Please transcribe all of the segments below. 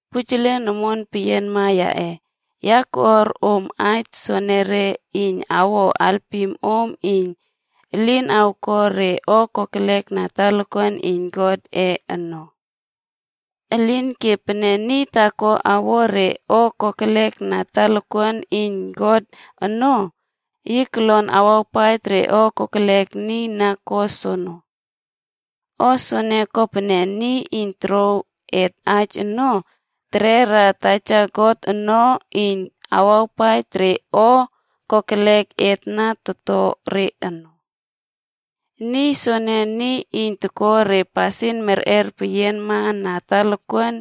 Pujelen omon peyianma yaꞌe, ya takꞌuar om aij soenere iyn awo alpim om iyn elin awko re o kokelek na talakuan iyn Godꞌe ono. Elinke, pene niy taako awo re o kokelek na talakuan iyn God ono, yi kolon awawpaij re o kokelek niy na ko soono. O soene kopene, aNiy Iyn Tokouw Et Aij ono, tekera Taja God ono iyn takawpaij re o kokelek et na toto re ono. Niy soene, niy iyn toko re pasin merꞌer peyianma na talakuan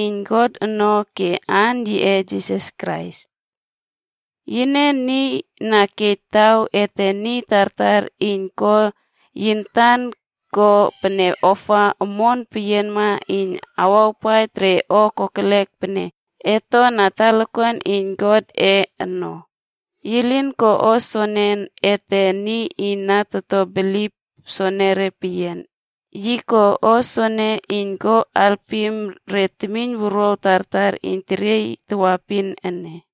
iyn God ono ke aan yiꞌe Jisas Krais. Yine, niy na kej taw ete niy tartar iyn ko yi antan ko pene ofa omon peyianma iyn kawpaij re o kokelek pene et to na talakuan iyn Godꞌe ono. Yi lin ko o soene ete niy na toto bilip soenere peyian, yi ko o soene iyn ko alpim re temiyn wuruaw tartar iyn teriey tawaepin ene.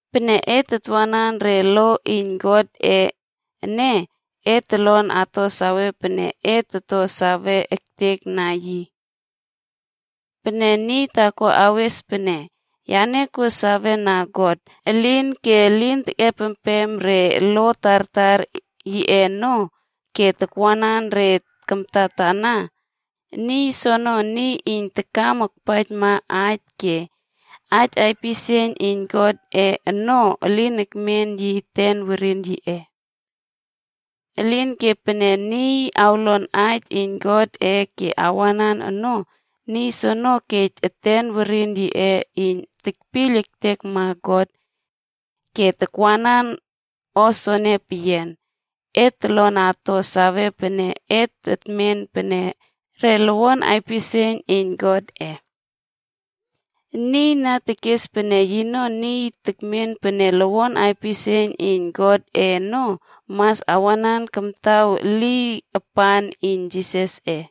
Pene et atwanan re lo iyn Godꞌe ene, et tolon ato sawe pene et to sawe ektekna yi. Pene niy taako awes aij pene, “Yane kuo sawena God,” elinke elin tekꞌepempem re lo tartar yiꞌe ono ke takwanan re kamtatana, niy soono niy iyn takam akpaijma aij ke aij pisieiyn iyn Godꞌe ono elin ekmen yi eten werin yiꞌe. Elinke pene niy awlon aij iyn Godꞌe ke awanan ono, niy soene kej eten werin yiꞌe iyn tekpiyl ektekma God. Ke tawantan soene peyian, et tolon ato sawe pene et tetmen pene re lowon aipisieiyn iyn Godꞌe. Niy na tekes pene yino niy tekmen pene lowon aipisieiyn iyn Godꞌe ono, mas awanan kamtaw eliy apan iyn Jisasꞌe.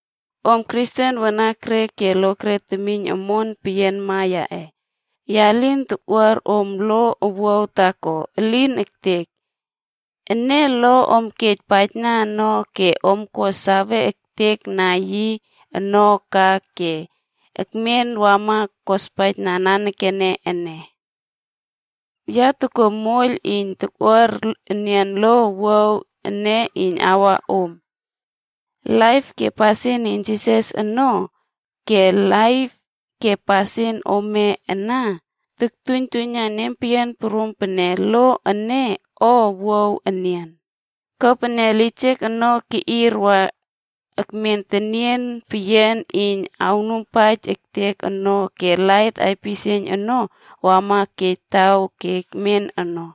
Om Kristen wanakre ke lokre temiyn omon peyianma yaꞌe, ya lin tokꞌuar om lo owuaw taako. Elin ektek! Ene lo om kej paijna no ke om ko sawe ektekna yi ono ka ke kemen wa wama kospaijna nanekene ene. Ya tokuo moiyl iyn tokꞌuar enian lo owuaw ene iyn awa om. Laip ke pasin iyn Jisasꞌe ono, ke laip ke pasin ome ana toktuiynjuiyna nempeyian prum pene lo ene o owuaw enian. Kopene lijek ono keꞌir wa ekmen tenien peyian iyn awnuiyn ektek ono ke lait aipisieiyn ono wama kej taw ke ekmen ono.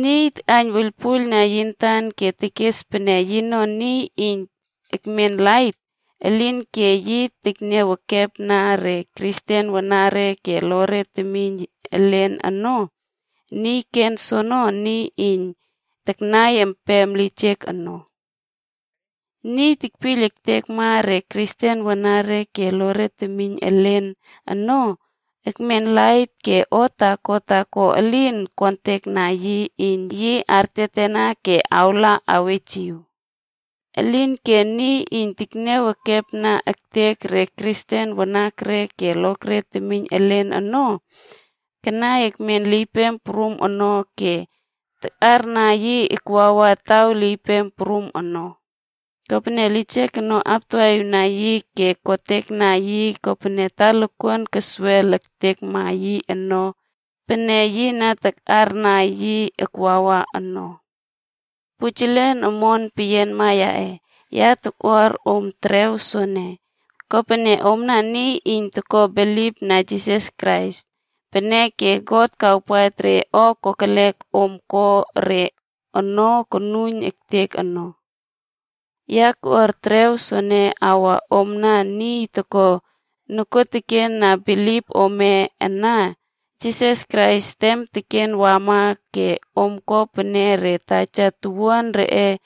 Niy takꞌaiyn wuiylpuiylna yi antan ke tekes pene yino niy iyn ekmen lait, elinke yi tekniaw ekepna re Kristen wanakre ke lokre temiyn elen ono, niy ken soono niy iyn kanai ekmen lijek ono. Niy tekpiyl ektekma re Kristen wanakre ke lokre temiyn elen ono, ekmen lait ke o taako taako elin okontekna yi iyn yi artiatiana ke awla awejiw. Elinke niy iyn tekniaw ekepna ektek re Kristen wanakre ke lokre temiyn elen ono, kanai ekmen liypem prum ono ke takꞌarna yi akwawa taw liypem prum ono. Kopene, lijek ono aptawaꞌiwna yi ke kotekna yi kopene talakuan keswel ektekma yi ono ke yi lin ko sawena taw pene yi na takꞌarna yi akwawa ono. Pujelen omon peyianma yaꞌe, ya tokꞌuar om terew soene, kopene omna niy iyn toko bilipna Jisas Krais. Peneke God kawpaij re o kokelek om ko re ono konuiyn ektek ono. Ya tokꞌuar terew soene akwa omna niy okto nokuotekena bilip ome na Jisas Krais tem teken wama ke om ko pene re taja towuan reꞌe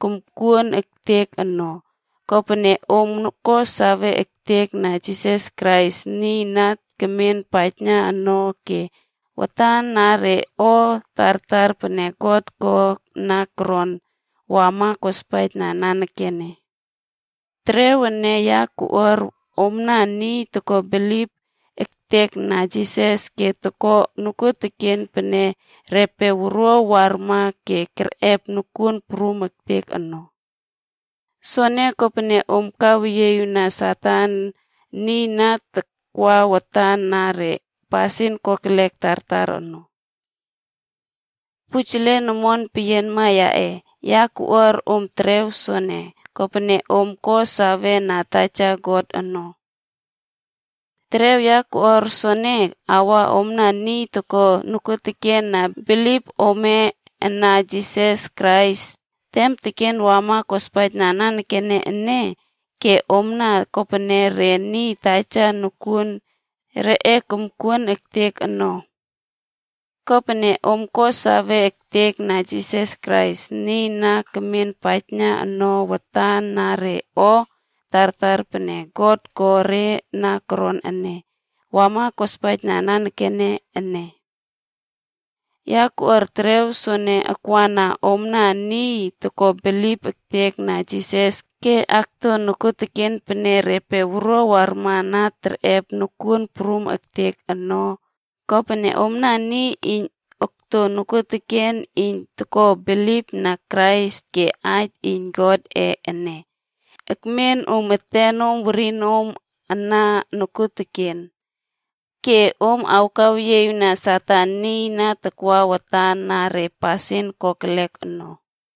komkuon ektek ono, kopene om ko sawe ektekna Jisas Krais, niy na kemen paijna no ke watana re o tartar pene God ko re na koron, wama kospaijna nanekene. Terew ene ya tokꞌuar omna niy toko bilip ektekna Jisas ke akto nokuoteken pene repe wuruaw warma na kerꞌep nokuon prum ektek ono. Soene kopene om kaweyieꞌiwna Satan, niy na takwa watan na re pasin kokelek tartar ono. Pujelen omon peyianma yaꞌe, ya koꞌuar om terew soene, kopene om ko save na Taja God ono. Terew ya koꞌuar soene akwa omna niy okto nokuotekena bilip ome na Jisas Krais tem teken wama kospaijna nanekene ene ke omna kopene re re taja towuan reꞌe komkuon ektek ono. Kopene om ko sawe ektekna Jisas Krais, niy na kemen paijna no watan na re o tartar pene God ko re na koron ene, wama kospaijna nanekene ene. Ya koꞌuar terew soene akwana omna niy toko bilip ektekna Jisas ke akto nokuoteken pene repe wuruaw warma na kerꞌep nokuon prum ektek ono, kopene omna niy iyn okto nokuoteken iyn toko bilipna Krais ke aij iyn Godꞌe ene ekmen om etenom werinom ana nokuoteken, ke om kaweyieꞌiwna Satan, niy na takwa watan na re pasin kokelek ono.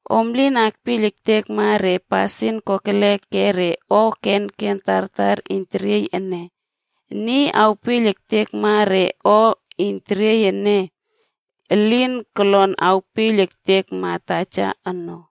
Om lin akpiyl ektekma re pasin kokelek ke re o kenken tartar iyn teriey ene. Niy awpiyl ektekma re o iyn teriey ene, elin kolon awpiyl ektekma Taja ono.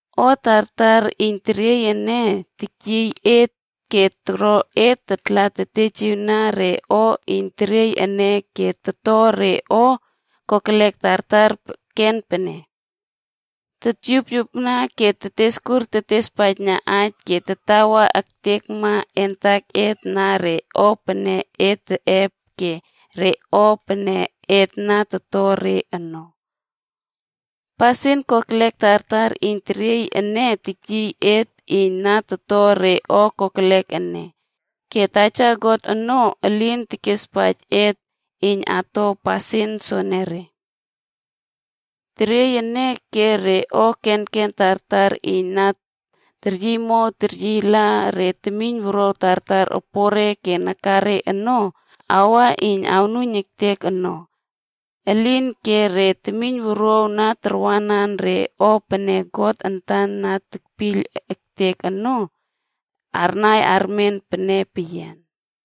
O tartar iyn teriey ene teryiy et ke toro et tatla tetejiwna re o iyn teriey ene ke toto re o kokelek tartar ken pene: totyupyupna ke teteskur tetespaijna aij ke tatawa ektekma et antaket na re o pene et teꞌep ke re o pene et na toto re ono. Pasin kokelek tartar iyn teriey ene teryiy et iyn na toto re o kokelek ene. Ke Taja God ono, elin kespaij et iyn ato pasin soenere. Teriey ene ke re o kenken tartar iyn na teryiymow teryiyla re temiynwuruaw tartar opore ke nakare ono, akwa iyn awnuiyn ektek ono. Elinke re temiynwuruaw na tarwanan re o pene God antan na tekpiyl ektek ono, arnai armen pene peyian.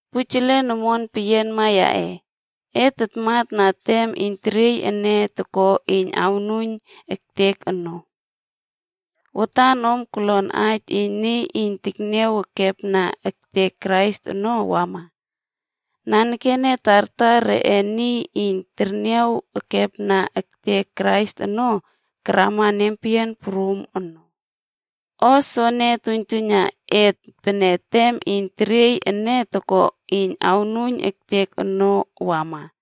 Pujelen omon peyianma yaꞌe, et tamana tem iyn teriey ene toko iyn awnuiyn ektek onob. Watan om kolon aij iyn niy iyn tekniaw ekepna ektek Krais ono awama. Nanekene, tartar reꞌe niy iyn terniaw ekepna ektek Krais ono karama nempeyian prum ono. O soene toktuiynjuiyna et pene tem iyn teriey ene toko iyn awnuiyn ektek ono wama.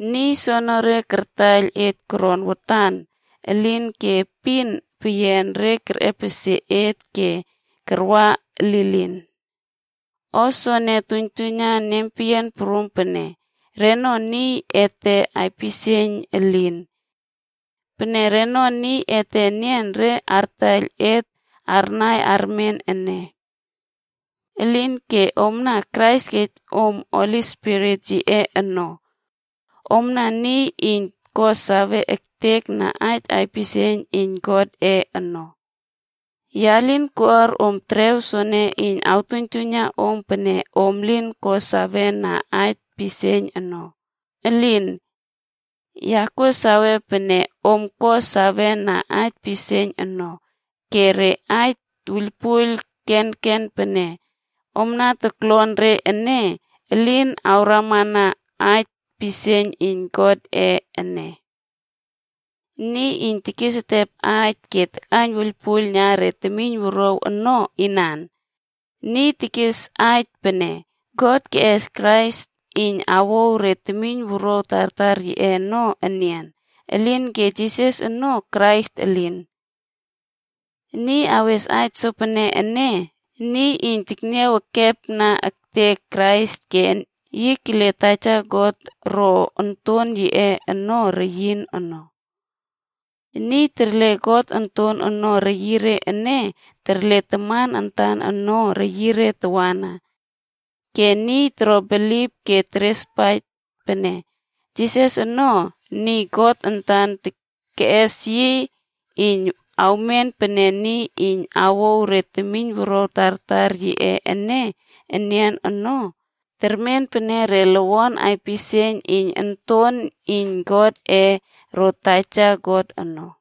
Niy soonore kartaiyl et koron watan, elinke epin peyian re kerꞌepesie et ke karwa lilin. O soene, toktuiynjuiyna nempeyian prum pene, reno niy ete aipisieiyn elin. Pene reno niy ete nian re artaiyl et arnai armen ene. Elinke omna, Krais kej om Holi Spirit yiꞌe no. Omna niy iyn ko sawe ektekna aij aipisieiyn iyn Godꞌe ono. Ya lin koꞌuar om terew soene iyn awtuiynjuiyna om pene om lin ko sawena aij pisieiyn ono. Elin! Ya kuo sawe pene om ko sawena aij pisieiyn no, ke re aij wuiylpuiyl kenken pene om na toklon re ene, elin akrama na aij pisieiyn iyn Godꞌe ene. Niy iyn tekesetep aij ke takꞌaiyn wuiylpuiylna re temiynwuruaw ono, inan? Niy tekes aij pene, “God keꞌes Krais iyn awouw re temiynwuruaw tartar yiꞌe ono enian, elinke Jisas ono Krais elin.” Niy awes aij sopene ene, niy iyn tekniaw ekepna ektek Krais ke yi kele Taja God ro Onton yiꞌe ono reyin no. Niy terle God Onton ono reyire ene, terle Taman antan ono reyire tawana. Ke niy toro bilip ke terespaij pene, “Jisas ono, niy God antan keꞌes yi iyn awmen pene niy iyn awouw re temiynwuruaw tartar yiꞌe ene enian ono,” termen pene re lowon aipisieiyn iyn Onton iyn Godꞌe ro Taja God ono.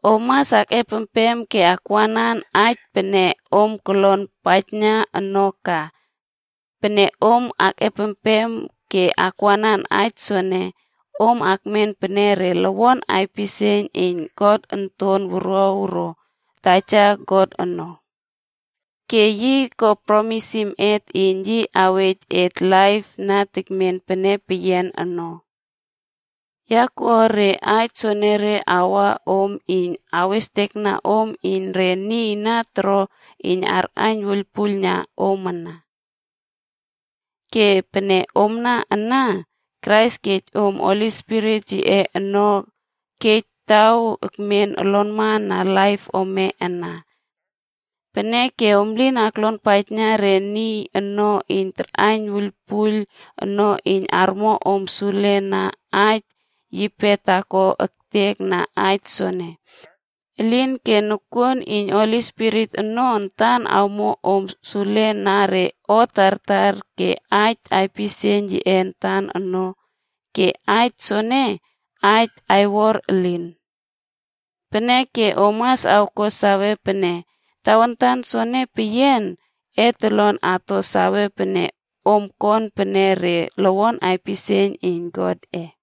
Om mas akꞌempem ke akwanan aij pene om kolon paijna no ka. Pene om akꞌempem ke akwanan aij soene, om akmen pene re lowon aipisieiyn iyn God Onton Wuruaw ro Taja God ono. Ke yi ko promisim et iyn yi awej et laip na tekmen pene peyian ono. Ya koꞌuar re aij soenere akwa om iyn awistekna om iyn re niy na toro iyn arꞌaiyn wuiylpuiylna om ana. Ke pene omna ana, Krais kej om Holi Spirit yiꞌe ono kej taw ekmen olonma na laip ome ana. Peneke om lin aklonpaijna re niy ono iyn tarꞌaiyn wuiylpuiyl ono iyn armo om sule na aij yipe taako ektek na aij soene. Elinke nokuon iyn Holi Spirit ono antan komo om sule na re o tartar ke aij aipisieiyn yiꞌe antan ono ke aij soene aij aiwor elin. Peneke om mas awko sawe pene, tawantan soene peyian, et tolon ato sawe pene om kon pene re lowon aipisieiyn iyn Godꞌe.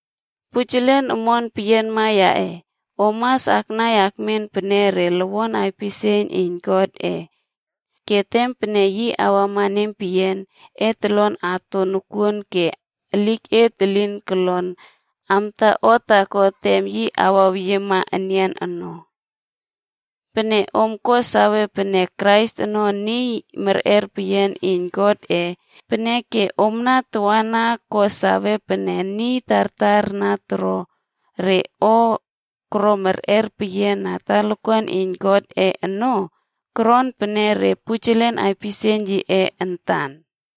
Pujelen omon peyianma yaꞌe, om mas aknai akmen pene re lowon aipisieiyn iyn Godꞌe. Ke tem pene yi awama nempeyian, et tolon ato nokuon ke eliket elin kolon amta o taako tem yi awaweyiema enian ono. Pene om ko sawe pene Krais ono niy merꞌer peyian iyn Godꞌe, peneke omna tawana ko sawe pene niy tartar na toro re o koro merꞌer peyian na talakuan iyn Godꞌe ono, koron pene re pujelen aipisieiyn yiꞌe antan.